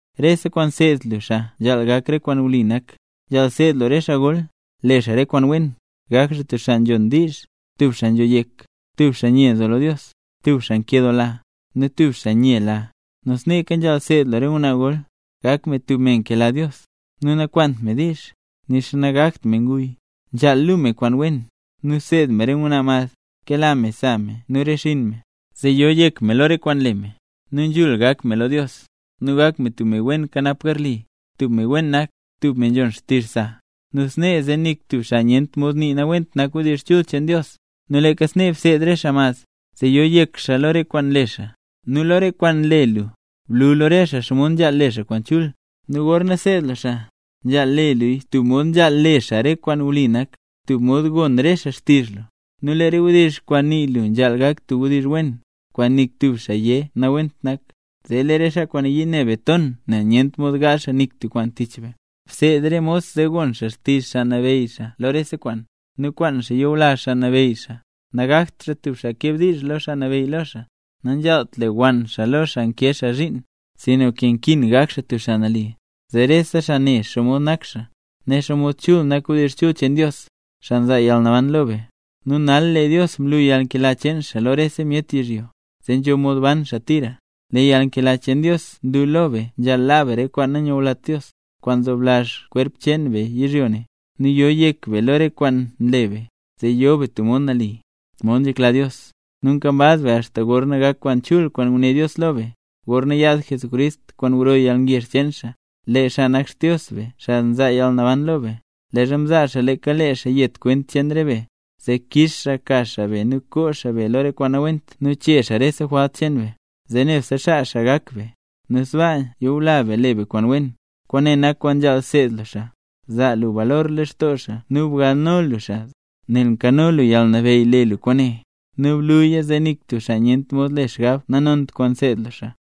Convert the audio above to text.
Rese kwaan seed lu re xaa nzhaal gak re kwaan wli nak. Nzhaal seed lu re xaa gol: le xaa re kwaan wen, gak xaa tub xaa nzhon diizh, tub xaa nzho yek, tub xaa nye nzo lo Dios, tub xaa nkedoola, nu tub xaa nyela. Nu sneeka nzhaal seed lu re ngwnaa gol gak me tub me nkela Dios, nu nakwaant me diizh, nixa nagakt me nguy. Nzhaal luu me kwaan wen, nu seed me re ngwnaa mad kela me sa me nu re xinn me, zee yo yek me lo re kwaan nle me, nu nzhul gak me lo Dios, nu gak me tub me wen nkanap garli, tub me wen nak, tub me nzhon xtizh sa. Nu snee zee nik tub xaa nyent mod nii nawent nak wdizh chul cheen Dios. Nu leeka snee bseed re xaa mad, zee yo yek xaa lo re kwaan nle xaa. Nu lo re kwaan nle lu, blu lo re xaa xomod nzhaal le xaa kwaan chul. Nu gorna seed lu xaa, nzhaal le luya tub mod nali, tub mod gon re xaa xtizh lu. Nu lee re wdizh kwaan nii lu nzhaal gak tub wdizh wen, kwaan nik tub xaa yé nawent nak, zee lee re xaa kwaan nayii ne be ton nel nyent mod gaazh xaa nik tub kwaan tich be. Bseed re mos, zee gon xaa xtizh xaa nabeyy xaa lo rese kwaan, nu kwaan xaa yula xaa nabeyy xaa, nagakt xaa tub xaa keb diizh lo xaa nabeyy lo xaa. Nanzhaalt lewann xaa lo xaa nkee xaa zhiin, sinka nkin gak xaa tub xaa nali, zee rese xaa ne xomod nak xaa, zee ne xaa xomod chul nak wdizh chul cheen Dios, xaa nzaa yalnaban lo be. Nu nal lee Dios mlu yalnkela cheen xaa lo rese myet yizhyo, zee nzho mod ban xaa tira. Lee yalnkela cheen Dios nlu lo be nzhaal laa be re kwaan nanyulat Dios, kwaan nzoblazh kwerp cheen be yizhyo ne; nu yo yek be lo re kwaan nle be, zee yo be tub mod nali, mod nzhekla Dios. Nu nkambaz be axta gorna gak kwaan chul kwaan nguné Dios lo be, gorna yaad Jesucrist kwaan gro yalngezh cheen xaa. Lee xaa nak Xdios be, xaa nzaa yalnaban lo be; leezha mzaa xaa leeka lee xaa yet kwent cheen re be, zee kix xaa ka xaa be nu koo xaa be lo re kwaan nawent nu chee xaa rese jwalt cheen be, zee nebse xaa xaa gak be, nu sbaa yula be le be kwaan wen. Kwaane nak kwaan nzhaal seed lu xaa, zaa lu balor lextoo xaa nu galno lu xaa, nel nkano lu yalnabeyy le lu kwaane. Nu bluya zee nik tub xaa nyent mod le xgab nanont kwaan nseed lu xaa.